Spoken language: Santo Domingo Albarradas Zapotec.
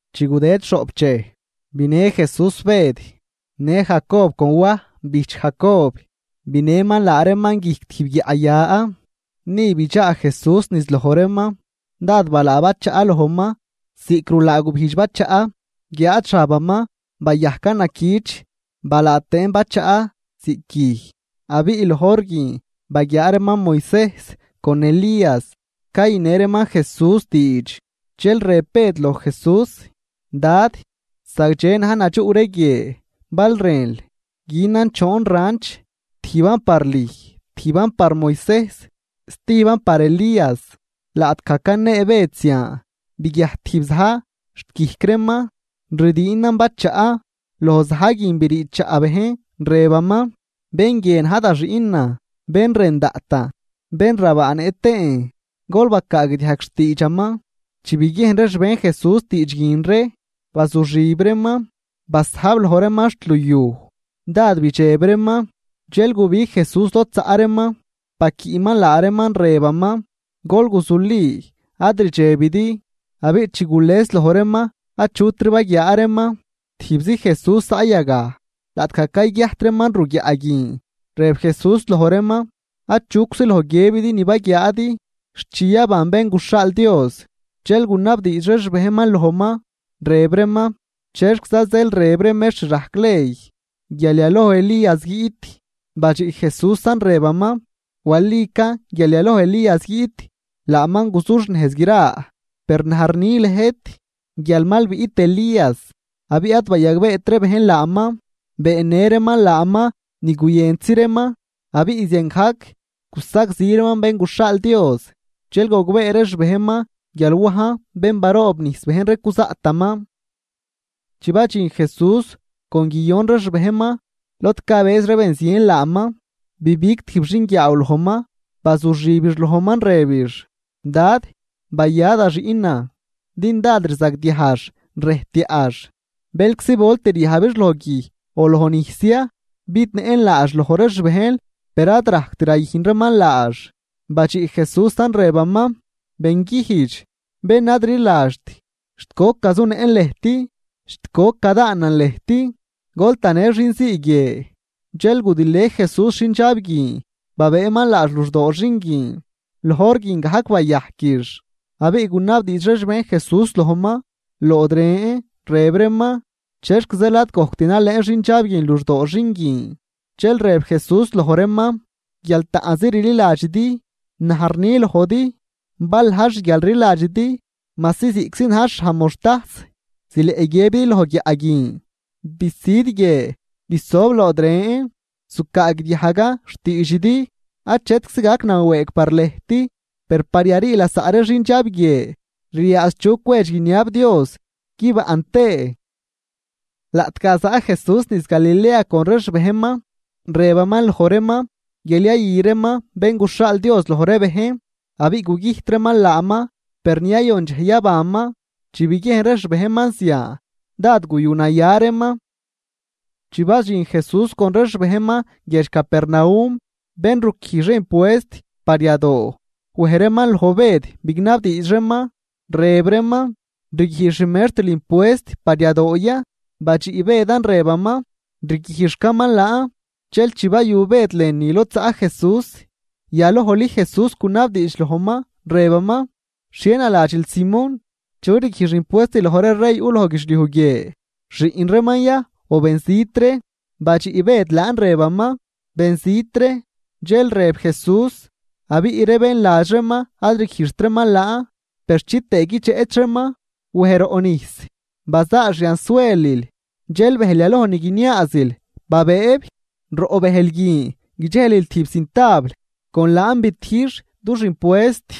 Chi gudëd xhoꞌp dxej, binë Jesús Bëd, në Jacob con Waj bijch Jacob, binëman laa reeman guijc tijb guiaꞌ ya. Ni bidxaa Jesús niz loj reeman. Dád balaa bachaꞌ lojman ziꞌc rulaa gubijdx bachaꞌ, guiáad xabaman bayajcan naquich, balaa tëën bachaꞌ ziꞌc guij. Abiꞌ loj hor guin baguiaa reeman Moisejs con Elías cayünë reeman Jesús diidx. Dxel rëb Bëd loj Jesús: ―Dad, ¡zagdxe na̱j nadxuꞌ ree guie! Bal rënl, günan choon ranch, tijban par lüj, tijban par Moisejs, stijban par Elías. Laꞌtgaj canee Bëd zian, biguiajt tijb za̱j xt guijc reeman ridiinan bachaꞌ, loj za̱j guin brii chaꞌ bejn rëbaman: ―Bén guie na̱j da Xiꞌnan, bén rën daꞌtan, bén rabaanëꞌ tëën, gol bacaagdiajg xtiidxaman. Chi biguiejn ree xbejn Jesús diidx guin ree, bazuxib reeman basajb loj reeman xt luyuj, dád bidxeb reeman. Dxel gubig Jesús lod zaꞌ reeman, baquiꞌman laa reeman, rëbaman: ―Gol guzuli, ad ridxebidi. Abiꞌ chi gules loj reeman achutri baguiaa reeman, tijbzi Jesús zaꞌ yagaj. Laꞌtgaj cayguiajt reeman ruguiaꞌ guin, rëb Jesús loj reeman: ―Achuczi loj guiëbidi ni baguiaadi, xt chi yaban Bén guxhaal Dios. Dxel gunabdiidx ree xbejnman lojman, rëb reeman: ―¿Chexquiza zeel rëb ree mextr rajc ley guial yaloj Elías guiꞌt? Badxiꞌ Jesúsan, rëbaman: ―Walican guial yaloj Elías guiꞌt, laaman guzuxnejz gra. Per naj rni lëjt guial mal biꞌt Elías, abiꞌ ad bayagbeet ree bejn laaman, beennë reeman laaman ni guyëntzi reeman. Abiꞌ ziangajc gusagzi reeman Bén guxhaal Dios. Dxel gogbee ree xbejnman guial Wajn bén baroobnijs bejn ree cuzaꞌtaman. Chi badxin Jesús con guiyon ree xbejnman, lod cabëz ree ben zien laaman bibig tijb xinguiaaw lojman, bazuxibix lojman rëbix: ―Dad, baya da xiꞌnan, din dád rzagdiajx rëjtyaꞌx. Bëlczi volt riyajbix lojguij o lojnijs ya. Bidnëꞌn laax loj ree xbejnl, per ad rajct rayüjn reeman laax. Badxiꞌ Jesúsan, rëbaman: ―¡Benguijdx, bén ad rliladxt! ¿Xt goc gazunëꞌn lëjt? ¿Xt goc gadaanan lëjt? Gol tanë xinzii guie. Dxel gudilë Jesús xindxab guin, babëëman laax luxdoo xin guin. Loj hor guin gajc bayajquix. Abiꞌ gunabdiidx ree xbejn Jesús lojman lood ren, rëb reeman: ―¿Chexc zeel ad gojct nalëën xindxab guin luxdoo xin guin? Dxel rëb Jesús loj reeman: ―Guial taꞌnzi rliladxidi. Naj rni lojdi bal na̱j xguialrliladxidi majsi ziꞌctzi na̱j xhaj moxhtajs, zileꞌ guiëbidi loj guiaꞌ guin: “Bisüd guie, bisob lood ren”, zucaagdiajgan xtiidxidi. Achetczi gac nawëëg par lëjt. Per par yarii lasaꞌ ree xindxab guie ryaadx chu cwedx guiniab Dios guibaꞌn tëë. Laꞌtgaj zaꞌ Jesús niz Galilea con ree xbejnman, rëbaman loj reeman guial yayü reeman Bén guxhaal Dios loj ree bejn, abiꞌ gugüjt reeman laaman, per ni yayon dxej yabanman. Chi biguiejn ree xbejnman zian, dád guyu naya reeman. Chi badxin Jesús con ree xbejnman guiedx Capernaum, bén ruquijx ree impuest par yadoo wej reeman loj Bëd bignabdiidx reeman, rëb reeman: ―¿Rguijx xmextril impuest par yadoo ya? Badxiꞌ Bëdan, rëbaman: ―Riguijxcaman laan. Dxel chi bayu Bëd lënü lod zaꞌ Jesús, yalojli Jesús gunabdiidx lojman, rëbaman: ―¿Xhie naladxil, Simón? ¿Chu rguijx impuest loj ree rey yuꞌ loj guidxliuj guie? ¿Xiꞌn reeman ya o benzit ree? Badxiꞌ Bëd laan rëbaman: ―Benzit ree. Dxel rëb Jesús: ―Abiꞌ ree bén ladx reeman ad rguijxt reeman laan. Per chitëë guidxeꞌch reeman, wej roꞌ nijs, bazaal xiansuelil, dxel bëjl yaloj ni guiniaazil babëëb. Roꞌ bëjl guin guidxelil tijb cintabl, con laan bitijx dux impuest.